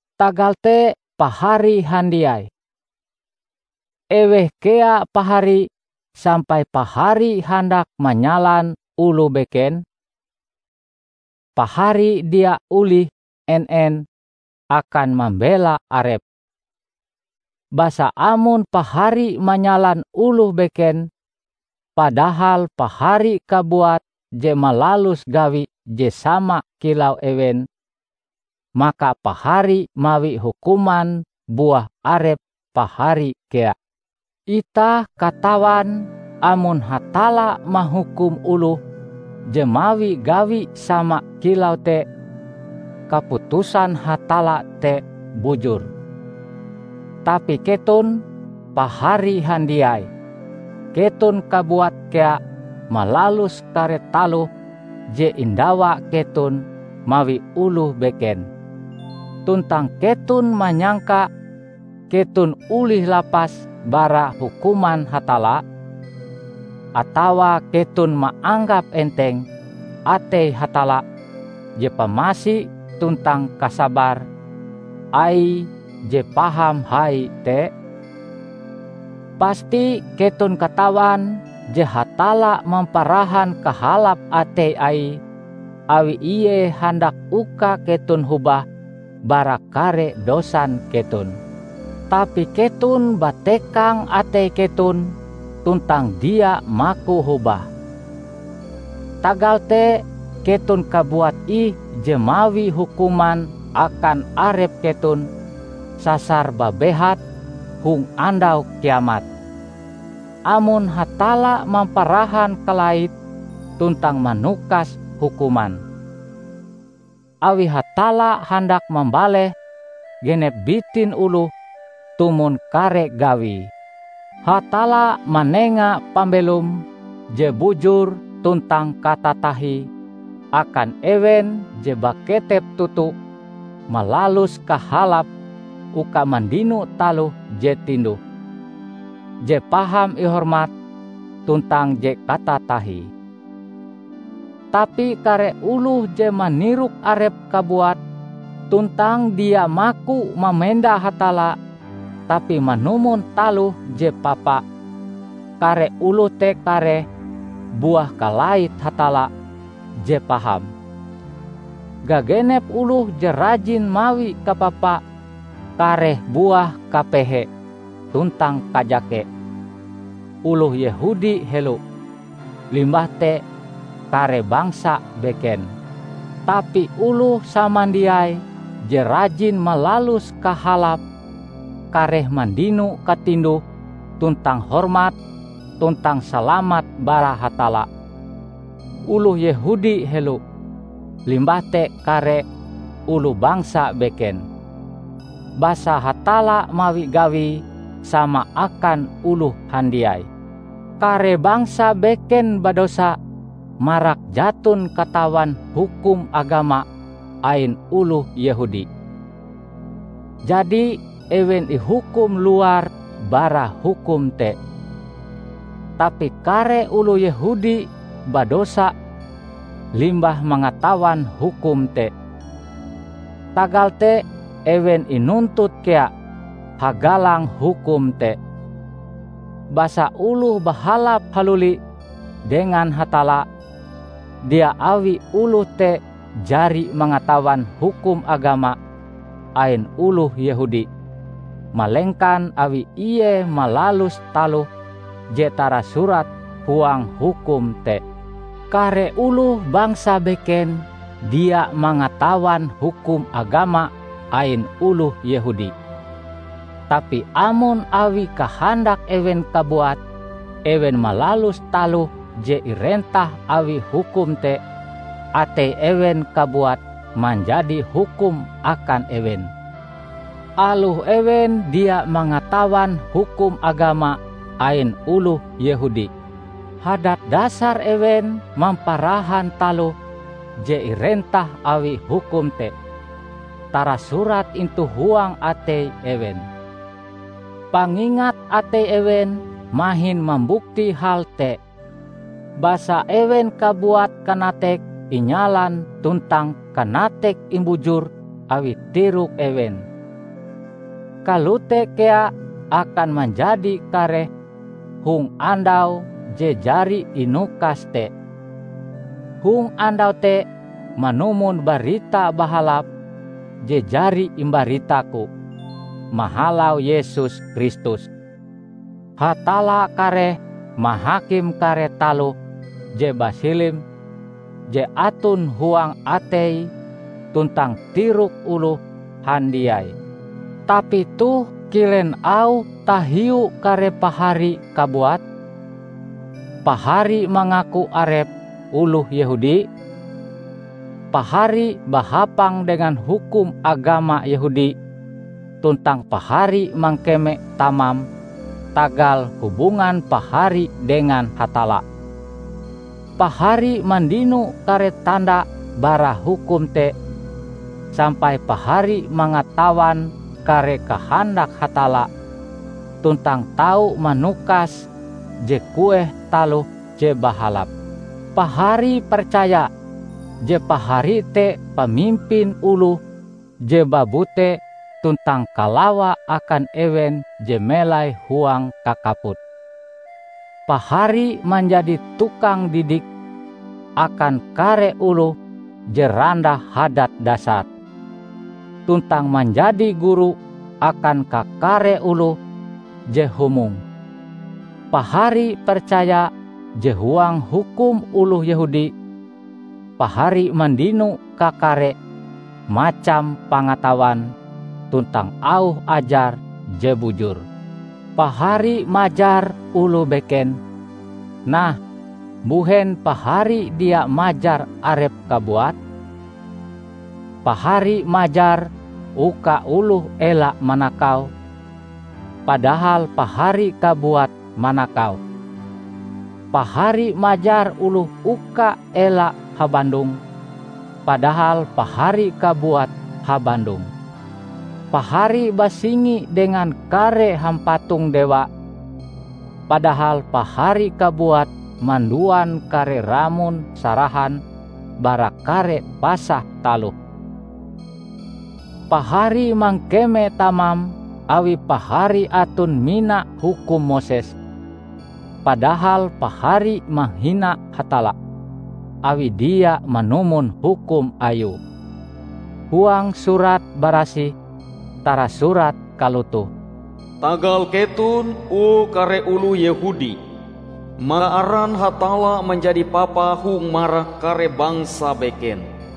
Tagal te pahari handiai, eweh kea pahari sampai pahari handak manyalan oloh beken? Pahari dia olih en-en akan mambela arep! Basa amon pahari manyalan oloh beken padahal pahari kabuat je malalus gawi je sama kilau ewen, maka pahari mawi hukuman buah arep pahari kea. Itah katawan amon Hatalla mahukum oloh je mawi gawi sama kilau te, kaputusan Hatalla te bujur. Tapi keton, pahari handiai, keton kabuat kea malalus kare taloh je indawa keton mawi oloh beken! Tuntang keton manyangka keton olih lapas bara hukuman Hatalla? Atawa keton maanggap enteng atei Hatalla je pamasi tuntang kasabar Aie je paham hai te? Pasti keton katawan je Hatalla mamparahan kahalap atei Aie awi Ie handak uka keton hobah bara kare dosan keton. Tapi keton batekang atei keton tuntang dia maku hobah. Tagal te keton kabuat ih je mawi hukuman akan arep keton sasar babehat hong Andau Kiamat, amon Hatalla mamparahan kalaite tuntang manukas hukuman. Awi Hatalla handak mambaleh genep bitin oloh tumon kare gawie. Hatalla manenga pambelom je bujur tuntang katatahie akan ewen je baketep toto malalus kahalap uka mandino taloh je tinduh, je paham ihormat tuntang je katatahie. Tapi kare oloh je manirok arepe kabuat tuntang dia maku mamenda Hatalla, tapi manumon taloh je papa, kare oloh te kareh buah kalait Hatalla je paham. Gagenep oloh je rajin mawi kapapa kareh buah kapehe tuntang kajake; oloh Yehudi helo, limbah te kare bangsa beken. Tapi oloh samandiai je rajin malalus kahalap kareh mandino katinduh tuntang hormat tuntang salamat bara Hatalla; oloh Yehudi helo, limbah te kare oloh bangsa beken. Basa Hatalla mawi gawie sama akan oloh handiai. Kare bangsa beken badosa marak jaton katawan hukum agama ain oloh Yehudi. Jadi ewen ihukum luar bara hukum te. Tapi kare oloh Yehudi badosa limbah mangatawan hukum te; tagal te ewen inuntut kea hagalang hukum te. Basa oloh bahalap haluli dengan Hatalla, dia awi oloh te jari mangatawan hukum agama ain oloh Yehudi, malengkan awi ie malalus taloh je tarasurat huang hukum te. Kare oloh bangsa beken dia mangatawan hukum agama ain oloh Yehudi. Tapi amon awi kahandak ewen kabuat ewen malalus taloh je irentah awi hukum te, atei ewen kabuat manjadi hukum akan ewen, aloh ewen dia mangatawan hukum agama ain oloh Yehudi. Hadat dasar ewen mamparahan taloh je irentah awi hukum te tarasurat intu huang atei ewen. Pangingat atei ewen mahin mambukti hal te, basa ewen kabuat kanateke inyalan tuntang kanateke imbujur awi tirok ewen. Kalote kea akan manjadi kareh hong andau je jari inukas te. Hong andau te -- manumon Barita Bahalap je jari imbaritaku -- mahalau Yesus Kristus, Hatalla kareh mahakim kare taloh je basilim je aton huang atei tuntang tirok oloh handiai. Tapi toh kilen auhe tahiu kare pahari kabuat? Pahari mangaku arep oloh Yehudi? Pahari bahapang dengan hukum agama Yehudi tuntang pahari mangekeme tamam tagal hubungan pahari dengan Hatalla. Pahari mandino kare tanda bara hukum te sampai pahari mangatawan kare kahandak Hatalla tuntang tau manukas je kueh taloh je bahalap. Pahari percaya je pahari te pamimpin oloh je babute tuntang kalawa akan ewen je melai huang kakaput; Pahari manjadi tukang didik akan kare oloh je randah hadat dasare, tuntang manjadi guru akan kakare oloh je humong. Pahari percaya je huang hukum oloh Yehudi, pahari mandino kakare macam pangatawan tuntang auh ajar je bujur. Pahari majar oloh beken; nah, mbuhen pahari dia majar arep kabuat? Pahari majar uka oloh ela manakau, padahal pahari kabuat manakau! Pahari majar oloh uka ela habandong, padahal pahari kabuat habandong! Pahari basingi dengan kare hampatong dewa, padahal pahari kabuat manduan kare ramon sarahan bara kare pasah taloh. Pahari mangkeme tamam awi pahari aton mina hukum Moses, padahal pahari mahina Hatalla awi dia manumon hukum Ayue. Huang Surat Barasih tarasurat kalotoh, "Tagal keton, o kare oloh Yehudi, maka aran Hatalla manjadi papa hong marak kare bangsa beken."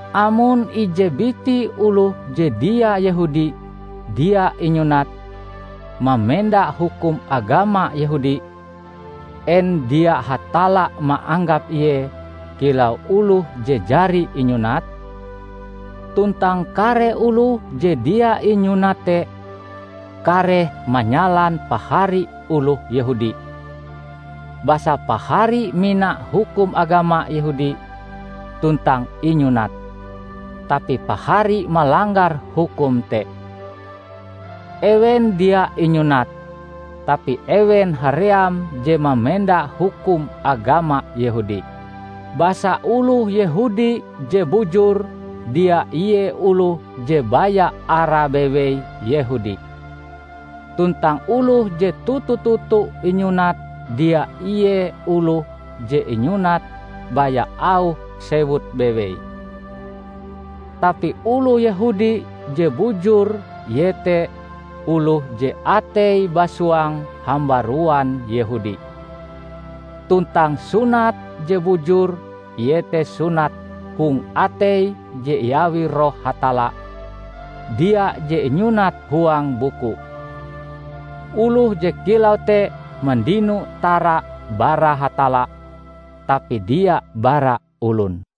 Amon ije biti oloh je dia Yehudi dia inyunat, mamenda hukum agama Yehudi, en dia Hatalla maanggap ie kilau oloh je jari inyunat? Tuntang kare oloh je dia inyunat te kareh manyalan pahari oloh Yehudi, basa pahari mina hukum agama Yehudi tuntang inyunat, tapi pahari malanggar hukum te. Ewen dia inyunat, tapi ewen haream je mamenda hukum agama Yehudi. Basa oloh Yehudi je bujur dia ie oloh je baya arae bewei Yehudi; tuntang oloh je toto-toto inyunat dia ie oloh je inyunat baya auh sewute bewei. Tapi oloh Yehudi je bujur iete oloh je ateie basuang hambaruan Yehudi; tuntang sunat je bujur iete sunat hong atei je iawi Roh Hatalla, dia je inyunat huang buku. Oloh je kilau te mandino tara bara Hatalla, tapi dia bara olon.